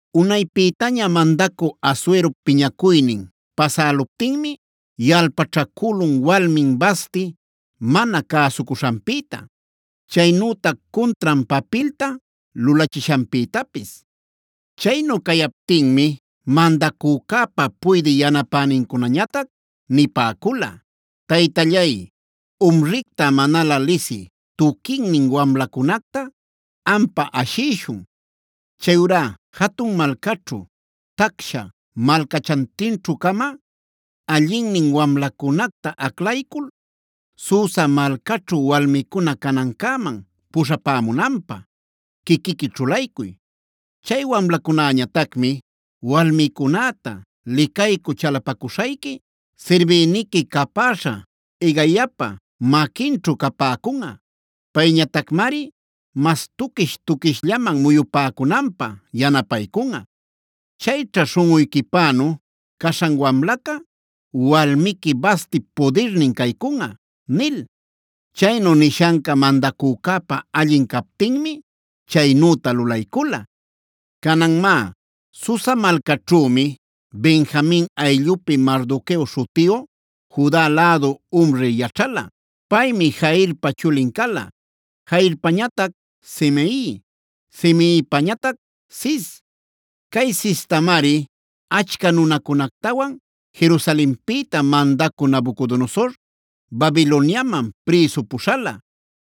Unaypïtaña mandacü Asuerop piñacuynin pasäluptinmi yalpaćhacülun walmin Vasti mana cäsucuśhanpïta, chaynütac cuntran papilta lulachishanpïtapis. Chaynu cayaptinmi mandacücäpa puydï yanapänincunañatac nipäcula: “Taytallay, umricta manalä lisï tuquinnin wamlacunacta ampä ashïshun. Chayurá jatun malcaćhu tacsha malcachantinćhu-cama allinnin wamlacunacta aclaycul, Susa malcaćhu walmicuna canancäman puśhapämunanpä quiquiqui ćhulaycuy. Chay wamlacunäñatacmi walmicunäta licaycü chalapacuśhayqui, sirbïniqui capäśha Hegaipa maquinćhu capäcunꞌa. Payñatacmari mas tuquish-tuquishllaman muyupäcunanpä yanapaycunꞌa. Chayćha śhunꞌuyquipänu caśhan wamlaca, walmiqui Vastip pudirnin caycunꞌa” nil. Chaynu nishanca mandacücäpa allin captinmi chaynüta lulaycula. Canan má, Susa malcaćhümi Benjamin ayllupi Mardoqueo śhutiyu Juda lädu umri yaćhala. Paymi Jairpa chulin cala, Jairpañatac Simei, Simeipañatac Cis. Cay Cistamari achca nunacunactawan Jerusalenpïta mandacü Nabucodonosor Babiloniaman prïsu puśhala.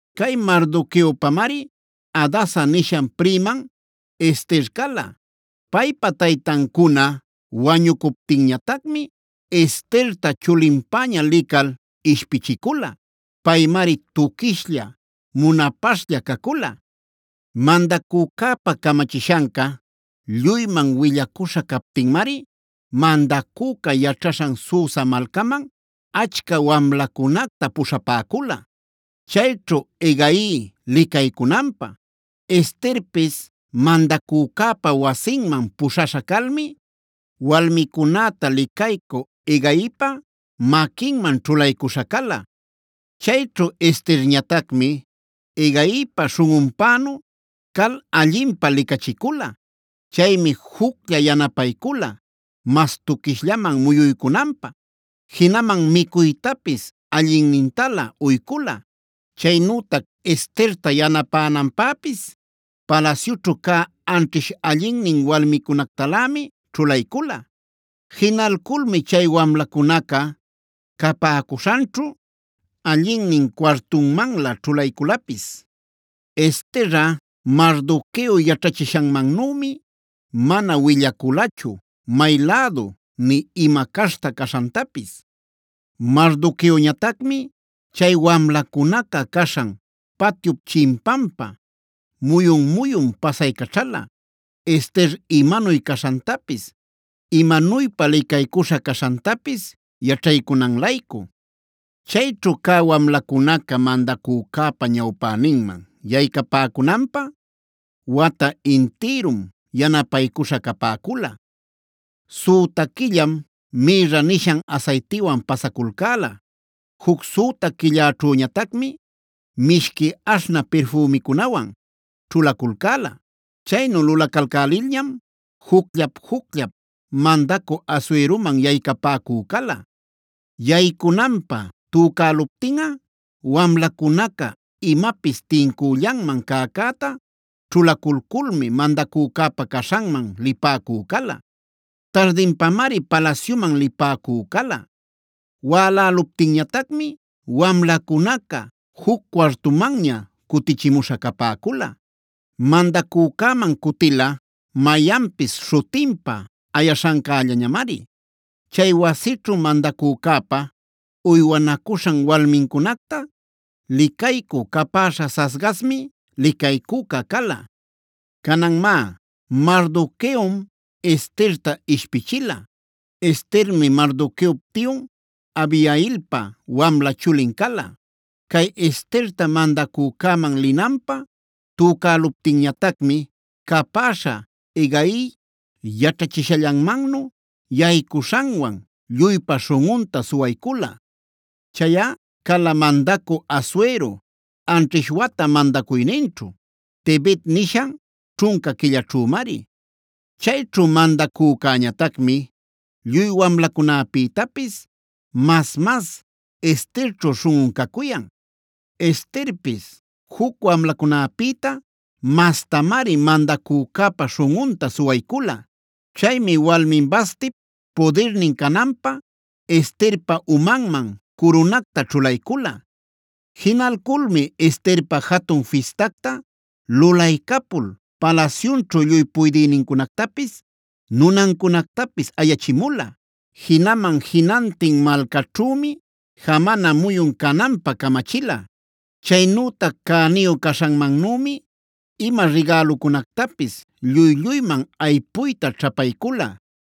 Cay Mardoqueopamari Hadasa nishan priman Ester cala. Paypa taytancuna wañucuptinñatacmi Esterta chulinpäña lical ishpichicula. Paymari tuquishlla munapaśhlla cacula. Mandacücäpa camachishanca lluyman willacuśha captinmari mandacüca yaćhaśhan Susa malcaman achca wamlacunacta puśhapäcula, chayćhu Hegai licaycunanpä. Esterpis mandacücäpa wasinman puśhaśha calmi walmicunäta licaycü Hegaipa maquinman ćhulaycuśha cala. Chayćhu Esterñatacmi Hegaipa śhunꞌunpänu cal allinpä licachicula. Chaymi juclla yanapaycula mas tuquishllaman muyuycunanpä, jinaman micuytapis allinnintalä uycula. Chaynütac Esterta yanapänanpäpis palasyućhu cä anćhish allinnin walmicunactalämi ćhulaycula. Jinalculmi chay wamlacunaca capäcuśhanćhu allinnin cuartunmanlä ćhulayculapis. Esterꞌa, Mardoqueo yaćhachishanmannümi mana willaculachu may lädu nï ima caśhta caśhantapis. Mardoqueoñatacmi chay wamlacunaca caśhan patyup chimpanpa muyun-muyun pasaycaćhala Ester imanuy caśhantapis, imanuypa licaycuśha caśhantapis yaćhaycunan-laycu. Chayćhu cä wamlacunaca mandacücäpa ñawpäninman yaycapäcunanpä, wata intïrum yanapaycuśha capäcula. Süta quillam mïrra nishan asaytiwan pasaculcäla, juc süta quilläćhüñatacmi mishqui aśhnä pirfümicunawan ćhulaculcäla. Chaynu lulacalcälilñam jucllap-jucllap mandacü Asueroman yaycapäcü cala. Yaycunanpä tücäluptinꞌa wamlacunaca imapis tincüllanman cäcäta ćhulaculculmi mandacücäpa caśhanman lipäcü cala. Tardinpamari palasyuman lipäcü cala. Wäläluptinñatacmi wamlacunaca juc cuartumanña cutichimuśha capäcula. Mandacücäman cutila mayanpis śhutinpa ayaśhancällañamari. Chay wasićhu mandacücäpa uywanacuśhan walmincunacta licaycü capäśha Saasgazmi licaycüca cala. Canan má, Mardoqueom Esterta ishpichila. (Estermi Mardoqueop tiyun Abihailpa wamla chulin cala.) Cay Esterta mandacücäman linanpä tücäluptinñatacmi capäśha Hegai yaćhachishallanmannu yaycuśhanwan lluypa śhunꞌunta suwaycula. Chayꞌa cala mandacü Asuero anćhish wata mandacuyninćhu, Tebet nishan ćhunca quillaćhümari. Chayćhu mandacücäñatacmi lluy wamlacunapïtapis mas-mas Esterćhu śhunꞌun cacuyan. Esterpis juc wamlacunäpïta mastamari mandacücäpa śhunꞌunta suwaycula. Chaymi walmin Vastip pudirnin cananpä Esterpa umanman curunacta ćhulaycula. Jinalculmi Esterpä jatun fistacta lulaycapul palasyunćhu lluy puydïnincunactapis, nunancunactapis ayachimula. Jinaman jinantin malcaćhümi jamana muyun cananpä camachila. Chaynütac cäniyu caśhanmannümi ima rigälucunactapis lluy-lluyman aypuyta ćhapaycula.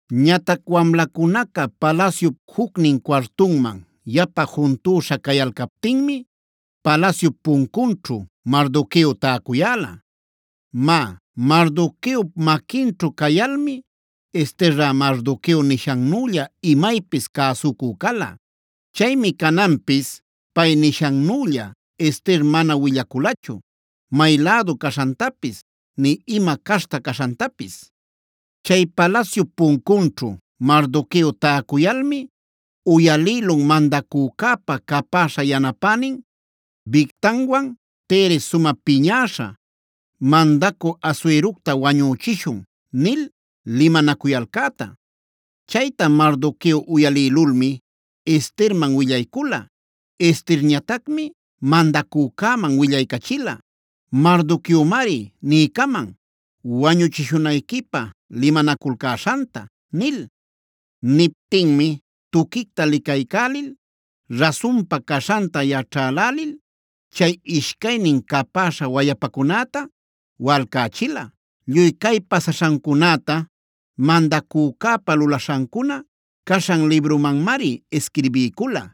Ñatac wamlacunaca palasyup jucnin cuartunman yapa juntüśha cayalcaptinmi palasyup puncunćhu Mardoqueo tacuyäla. Má, Mardoqueop maquinćhu cayalmi Esterꞌa Mardoqueo nishannülla imaypis cäsucü cala. Chaymi cananpis, pay nishannülla Ester mana willaculachu may lädu caśhantapis nï ima caśhta caśhantapis. Chay palasyup puncunćhu Mardoqueo täcuyalmi uyalïlun mandacücäpa capäśha yanapänin Bigtanwan Teres sumä piñäśha: “Mandacü Asuerocta wañüchishun” nil limanacuyalcäta. Chayta Mardoqueo uyalïlulmi Esterman willaycula. Esterñatacmi mandacücäman willaycachila: “Mardoqueomari niycaman wañuchishunayquipä limanaculcäśhanta” nil. Niptinmi tuquicta licaycälil rasunpa caśhanta yaćhälälil chay ishcaynin capäśha wayapacunäta walcächila. Lluy cay pasaśhancunäta mandacücäpa lulaśhancuna caśhan librunmanmari isquirbiycula.